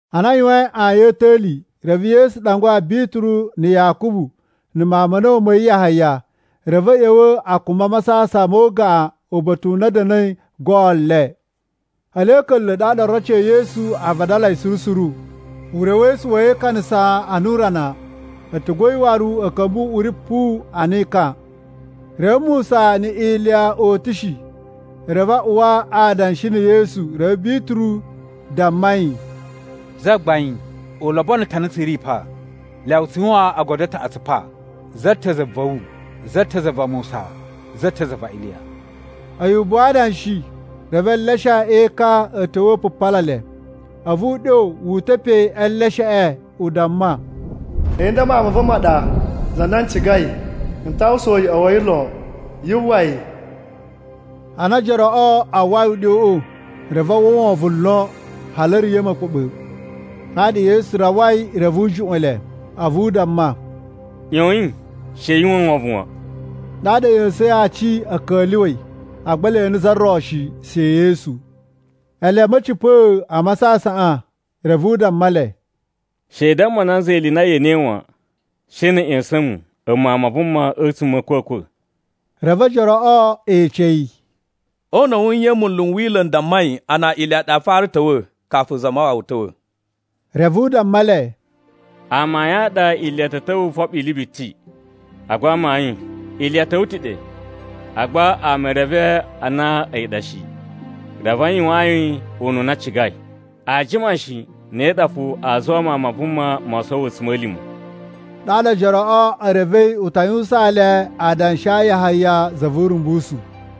Ana a yuwain ayin a̱ ta̱li, reve Yesu ɗangwa Bituru na̱ Yakubu na̱ mawun ma̱ a̱na̱wu ma̱ yi Yahaya. Reve a̱ ꞌya̱wa̱ a kumba masasan mo ugaꞌan uba̱ta̱ u na a̱ da̱na̱i goon le. Ele a̱ ka̱nla̱, ɗaɗa oroci e Yesu a vadalai suru suru. Urewesu wa̱ yi e ikanasa ana urana, a̱tugu a̱ yi waru a̱ ka̱mba̱ uꞌuri puwu ana ekan. Reve Musa na̱ Iliya o utushi, reve a uwa adanshi na̱ Yesu. Reve Bituru damma yi, “Zagbain, u lobono ta̱ a na tsu ri pa! Lyawa tsu yuwan ogodo a taꞌatsu pa, za ta̱ za va̱ wu, za ta̱ za va Musa, za ta̱ za va Iliya.” A̱yi ubuwu a adanshi, reve eleshe e ekan a̱ ta̱wa̱ u pupala le. A̱vu uɗyo wu uta̱ pe e elesheꞌe u damma, “A̱yi nda Mawun ma̱ va̱ ɗa, za na n cigai, n ta uwwusa uyoꞌo wa̱ yi lon. Yu uwwa yi!” Ana ojoroꞌo a uwwai uɗyoꞌo, reve a uwwa wovon lon hali a̱ riya̱ ma̱kpa̱ɓa̱. Ɗaɗa Yesu rawai reve u juꞌwa̱n le. A̱vu u damma, “ꞌYoyin, she yu uwwa wovon wan!” Ɗaɗa a̱ ꞌya̱sa̱in aci a̱ ka̱lyuwa̱i, agba e ene za ro shi, she Yesu. Ele a̱ ma̱cipa̱a̱ a masasaꞌan, reve u damma le, “She i damma nanza ili i na ye enei wan, she na̱ a̱ ꞌya̱sa̱n mu, a̱mu Mawun ma Vuma a̱tsuma̱ a̱ a̱kwa̱kwa̱.” Reve ojoroꞌo e ece yi, “O una̱ wu nye munlu n Wila̱ n dammai a na Iliya ɗa a fara ta̱wa̱ kafu Zamawawa ta̱wa̱?” Reve u damma le, “Amayun a ɗa Iliya ta̱ ta̱wa̱ u foɓo ili biti. Agba amayun, Iliya ta̱wa̱ ta̱ ɗe. Agba ama e reve a na a̱yi ɗa shi, reve a yuwaan yi ununa a cigai. Aa jima shi, ne ɗa fo aa zuwa Mawun ma Vuma mo sowo a̱tsuma̱lima̱.” Ɗaɗa ojoroꞌo e revei u ta yuwusaan le adanshi a Yahaya za vu Urumbusu.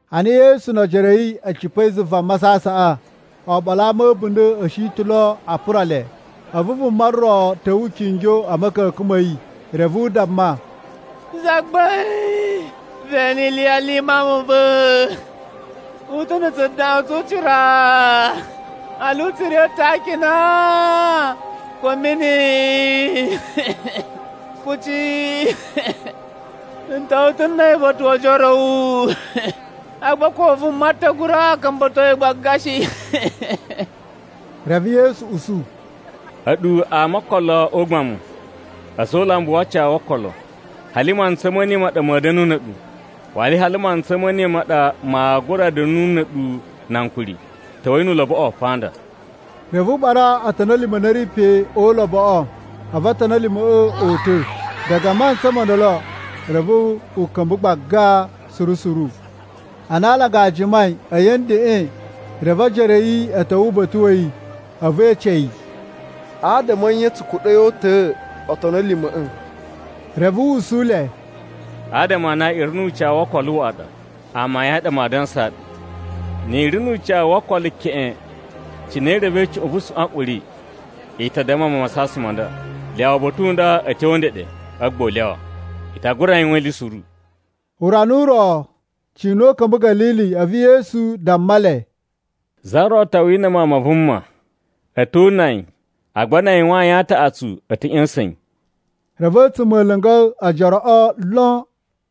Ana Yesu no ojoro a̱ yi a̱ cipa̱i zuva masasaꞌan, oɓolo a ama a̱ a̱bunda̱ a̱ shi ta̱ lo a pura le. A̱vu vuma ro ta̱wa̱ u kingyo a̱ ma̱ka̱ka̱n ma̱ yi. Reve u damma, “Zagbain, ve ene iliyali i mawun ma̱ va̱! U ta̱ na̱ tsudaꞌun tsu ucira, hali u tsu riya̱ ta̱ a akina ko a̱ mini kuci. N ta̱wa̱ ta̱ na̱ a̱yi uba̱ta̱ wo ojoro a̱ wu, agba ko vuma ta̱ gura ka̱mba̱to yi gbaga shi.” Reve Yesu usu, “A̱ɗu ama o okolo o ugbamu, a̱za̱ o ulambu wu ucawu wo okolo. Hali mantsa ma ne ma ɗa ma̱a̱ da̱na̱ na̱ a̱ɗu? Waru hali mantsa ma̱ ne ma ɗa maa gura da̱nu na̱ a̱ɗu na ankuri? Ta̱wa̱i nu uloboꞌo pa nda!” Reve u ɓara otoni a̱ lima̱ a na a̱ ri pe o uloboꞌo, a̱vu otoni a̱ lima̱ꞌa̱ o uta̱. Diga a mantsa mo ndolo, reve u ka̱mba̱ gbaga suru suru. Ana alanga a jimai, a̱yi a̱ ndeꞌen, reve ojoro a̱ yi a̱ ta̱wa̱ uba̱ta̱ wa̱ yi a̱vu e ece yi, “Adama a̱ nye tsu kuɗa̱i o uta̱a̱ otoni a̱ lima̱ꞌa̱?” Reve u usu le, “Adama a na i ri nu ucawu wo okolo waꞌa ɗa. Amayun a ɗa maa dansaa ɗu, ni i ri nu ucawu wo okolo keꞌen cine i revei cuꞌun vu suꞌwanꞌuri, i ta damma masasan ma nda, ‘Lyawa uba̱ta̱ u nda a̱ tyo ndeɗe,’ a̱vu gba u lyawa. I ta gura yuwan ili suru.” Urana u ro cina a̱ ka̱mba̱ Ga̱lili, a̱vu Yesu damma le, “Za ro ta wina Mawun ma Vuma. A̱ to una yi, agba na a yuwan ayin a taꞌatsu a̱ ta̱ ꞌya̱sa̱n yi.” Reve a̱tsuma̱ a̱ la̱nga̱ ojoroꞌo lon.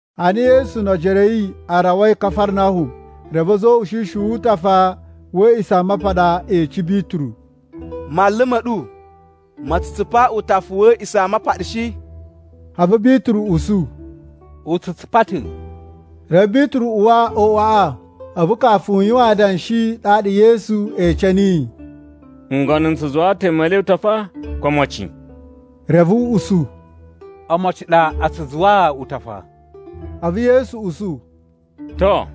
Ana Yesu no ojoro a̱ yi a rawai Kafarnahum, reve a̱za̱ o ushishi wu utafa wa̱ A̱a̱ꞌisamapaɗa e ece Bituru, “Manlu ma̱ ɗu ma tsu tsupa utafa wa̱ A̱a̱ꞌisamapaɗa shi?” A̱vu Bituru usu, “U tsu tsupa ta̱.” Reve Bituru uwa o uꞌwaꞌa, a̱vu kafu u yuwan adanshi, ɗaɗa Yesu ece niyi, “Ngono n tsu zuwaa ta̱ ama e le utafa, ko omocin?” Reve u usu, “Omocin a ɗa a tsu zuwaa utafa.” A̱vu Yesu usu, “To,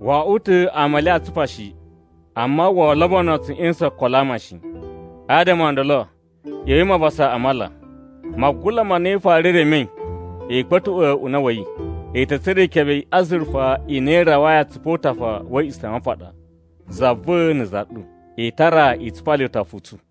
wo oꞌwo ta̱ ama e le aa tsupa shi. Amma woo lobono tsu ꞌya̱sa̱n okolo a ama shi. Adama o ndolo, ꞌya̱wa̱i mavusa a mala. Magula ma na i fara remei, i kpa̱tuꞌwa̱ una̱ wa̱ yi, i ta̱ tsura̱ ikebe i azurufa i na i rawai atsupu o utafa wa̱ A̱a̱ꞌisamapaɗa za va̱ na̱ za ɗu. I tara i tsupa le utafa u tsu.”